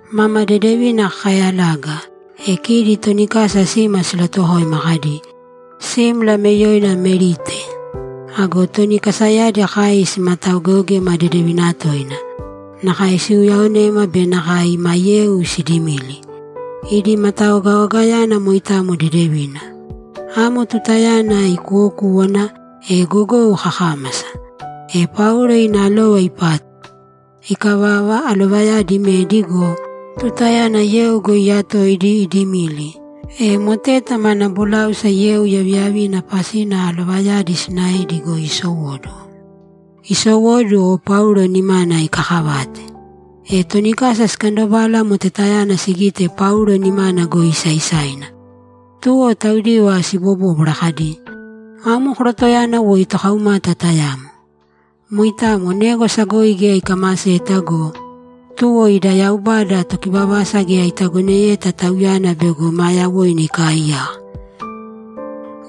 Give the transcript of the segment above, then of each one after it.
Mama dedevina kakayalaga, e kidi toni kasa sima silatuwokoima kadi, ‘Simla ame yoina Melite.’ Ago toni kasayadi kai simataogeogema dedevina toina. Nakae siuyaonema be nakae ima yeu sidimili. Idi mataogaogayana moitamo dedevina. Amo tutayana ikuwokúwana, e gogou kakámasa. E Paulo ina alova ipátuma. Ikavava, alovayadi imedi go, tutayana yeu goi iyatoidi, idimili, e moteta mana boláusa yeu yaviyavina pasina alovayadi sinaedi goi isowóduwo. Isowóduwo, Paulo nimana ikakavate. E toni kasa sikandobala motetayana sigite Paulo nimana goi isaisaina. Tuwo taudiva sibobóbwara kadi, ‘Amo korotoyana woi tokaumata tayamo. Moitamo négwasa goi geya ikamaseta go, tuwo ida yaubada Tokivavasa geya itagoneyeta tauyana bego ma yawoina ikaaiyaka.’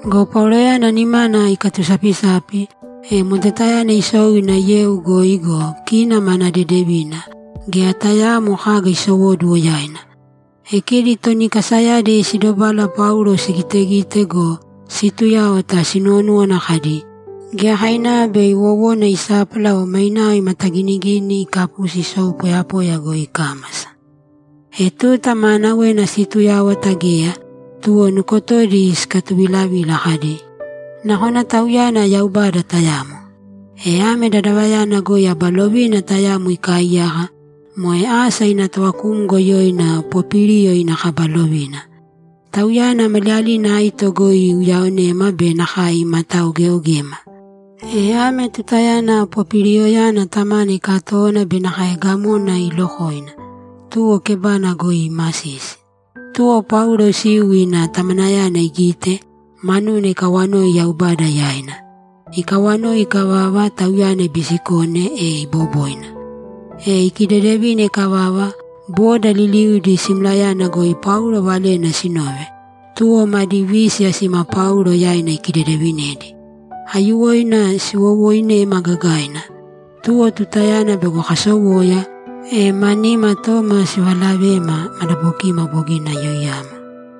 Go Pauloyana nimana ikatusapisapi, e motetayana isou ina yeu goi go, kina mana dedevina, geya tayaamo kaga isowóduwo yaina. E kidi toni kasayadi sidobala Paulo sigitegite go, situyáwata, sinuwonúwana kadi, ‘Giyakainava bei wowona isápala o mainao imataginigini ikapusi isou poyapoya goi ikámasa.’ E tuta maanawena situyáwata geya, tuwo nukotodi sikatuvilavila kadi, ‘Nakona tauyana yaubada tayamo.’ E ame dadavayana goi aba lovina tayamo ikaaiyaka, moe asa ina tovakumgo yoina Popiliyo ina kaba lovina. Tauyana maliyalina aito goi iuyaonema be nakae imataogeogema. E ame tutayana Popiliyoyana tamana ikatówana be nakae gamona iilokoina, tuwo kebana goi iimasisi. Tuwo Paulo isiu ina tamanayana igite, manuna ikawanoi Yaubada yaina. Ikawanoi ikavava, tauyana ibisikone, e iboboina. E ikidedevine ikavava, boda liliudi simlayana goi Paulo valena sinove, tuwo madi vísiya sima Paulo yaina ikidedevinedi. Aiyuwoina siwowoinema gagaina, tuwo tutayana bego kasowoya, e ma nimatooma sivalavema, madabokima bogina yoiyama.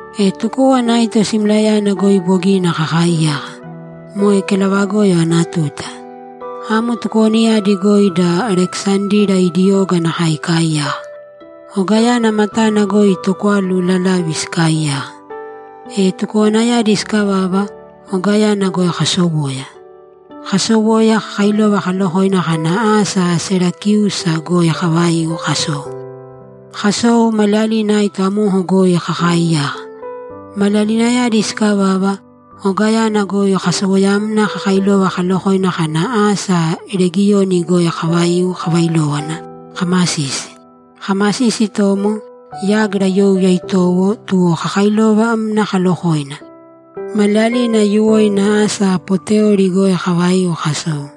E tukówana aito simlayana goi bogina kakaiyaka. Moe kelavagoyo ana tuta. Amo tukowanayadi goi da Alekisandira idi oga nakae ikaaiyaka. Ogayana matana goi tokwalu lalavi sikaaiyaka. E tukowanayadi sikavava, ogayana goi kasowoya. Kasowoya, kakailova kalokoina kana asa Serakiusa goi kavaiu kasou. Kasou, maliyalina aito amoko goi kakaaiyaka. Maliyalinayadi sikavava, ogayana goi kasowoyamna kakailova kalokoina kana asa Regiyoni goi kavaiu kavailówana kamasisi. Kamasisi itomo, yágira youya itowo, tuwo kakailovamna kalokoina. Maliyalina aiyuwoina asa Poteoli goi kavaiu kasou.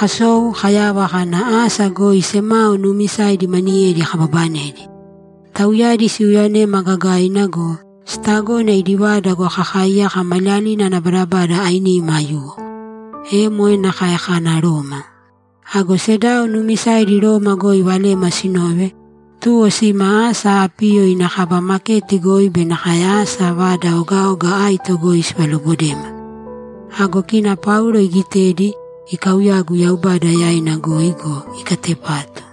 Kasou, kayava kana asa goi semao nuumisaidi maniyedi kababanedi. Tauyadi siuyaonema gagaina go, sitagona idi vada goi kakaiyaka maliyalina ana badabada ainima aiyuwo. E moe nakae kana Roma. Ago sedao nuumisaidi Roma goi valema sinove, tuwo sima asa Apiyo ina kaba maketi goi be nakae asa Vada Ogaoga Aito goi sivalobodema. Ago kina Paulo igitedi, ikauyagu Yaubada yaina goi go, ikatepatu.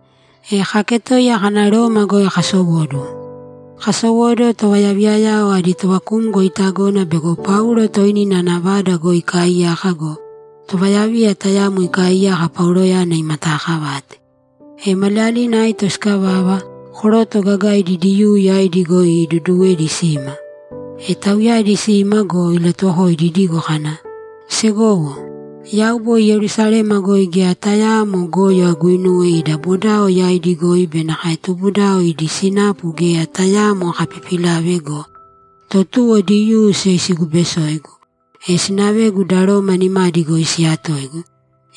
E kaketoiya kana Roma goi kasowóduwo. Kasowóduwo, tovayaviyayao adi tovakumgo itagona bego Paulo toinina ana vada goi ikaaiyaka go, tovayaviya tayamo ikaaiyaka Pauloyana imataakavate. E maliyalina aito sikavava, koroto gagaidi Diyuu yaidi goi iduduwedi sima. E tauyadi sima go, ilatuwokoidi idigo kana, ‘Segowo, yau boi Yerusalema goi geya tayaamo goyo aguinuwe ida bodao yaidi goi be nakae tubudao idi sinapu geya tayaamo akapipilave go, to tuwo Diyuu siyoisibesoigu, e sinavegu da Roma nimadi goi siyatoigu,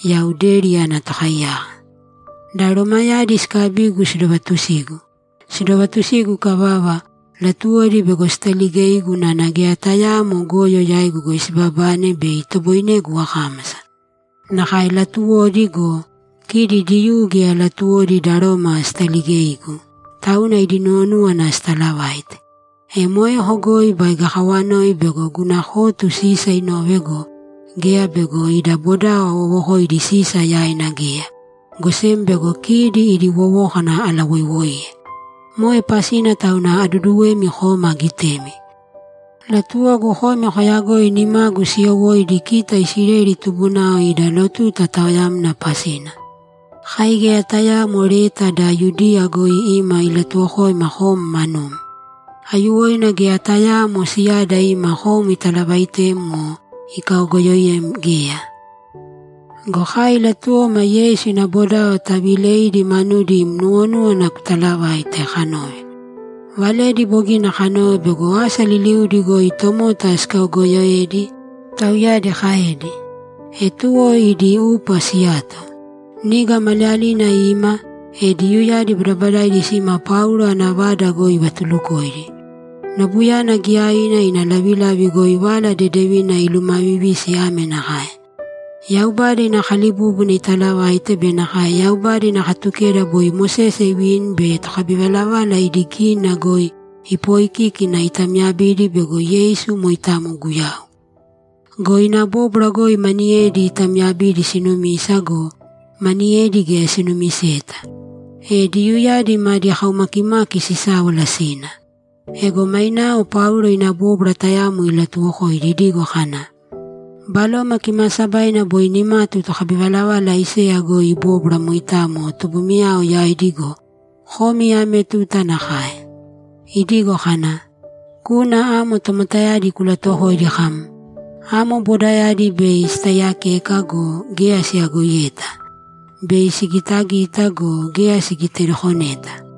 yau deri ana tokaiyaka. Da Romayadi sikabigu sidovatusigu. Sidovatusigu ikavava, latuwodi bego sitaligeigu unana geya tayaamo goyo yaigu goi sibabane bei itoboinegu akámasa. Nakae latuwodi go, kidi Diyuu geya latuwodi da Roma sitaligeigu, tauna idi nuwonúwana sitalavaite. E moeko goi baige akawanoi bego guna kotu Sisa inove go, geya bego ida bodao awowokoidi Sisa yaina geya, go sem bego kidi idi wowókana alawoiwoiye. Moe pasina tauna aduduwemi koma agitemi. Latuwogu komi koyagoi nimagu siyowóidi kita Isileli tubunao ida lotuta taoyamna pasina.’ ‘Kai geya tayaamo leta da Yudiya goi ima ilatuwokoima kom manum. Aiyuwoina geya tayaamo siyada ima kom italavaitem o ikaogoyoem geya. Go kai latuwoma Yeisu ina bodao taviileidi manudi im nuwonúwana kutalavaite, kanove. Valedi bogina kanove bego asa liliudi goi tomota sikaogoyoedi’, tauyadi kaedi. E tuwo idi upa siyato. Niga maliyalinayana ima, e Diyuuyadi badabadaidi sima Paulo ana vada goi ivatulukoidi. Nobuyana giyaina ina lavilavi goi Vala Dedevina ilumavivisi ame nakae: Yaubada ina kalibúbuna italavaite be nakae Yaubada ina Katukeda boi Mosese ivini be tokabivalavala idi gínina goi ipoikíkina itamyabidi bego Yeisu moitamo Guyau. Go ina bóbwara goi maniyedi itamyabidi sinumisa go, maniyedi geya sinumiseta. E Diyuuyadi madi kaumakimaki sisáwala sina. Ego mainao Paulo ina bóbwara tayamo ilatuwokoidi idigo kana, ‘Baloma Kimaasabaina boi nimatu tokabivalavala Aiseya goi ibóbwara moitamo tubumiyao yaidi go, komi ame tuta nakae. Idigo kana, “Kūna amo tomotayadi kulatuwokōidi kam, ‘Bei kotaiiyakeka go, geya koyagoiyeta. Bei kogitagita go, geya kogitadokoneta.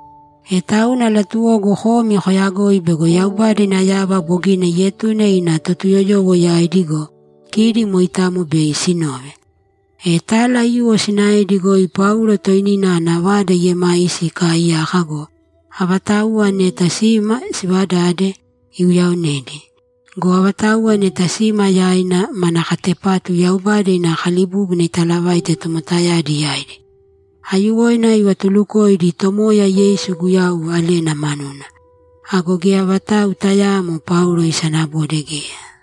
E tauna latuwogu komi koyagoi bego Yaubada ina yava bogina ietune ina Totuyoyowo yaidi go, kidi moitamo bei sinove.’ E tala aiyuwo sinaedi goi Paulo toinina ana vada iiemaisi ikaaiyaka go, avatauwa neta sima sivadade, iuyaonedi. Go avatauwa neta sima yaina, mana katepatu Yaubada ina Kalibúbuna italavaite tomotayadi yaidi. Aiyuwoina ivatulukoidi Tomoya Yeisu Guyau valena manuna. Ago geya vatau tayaamo Paulo isanabode geya.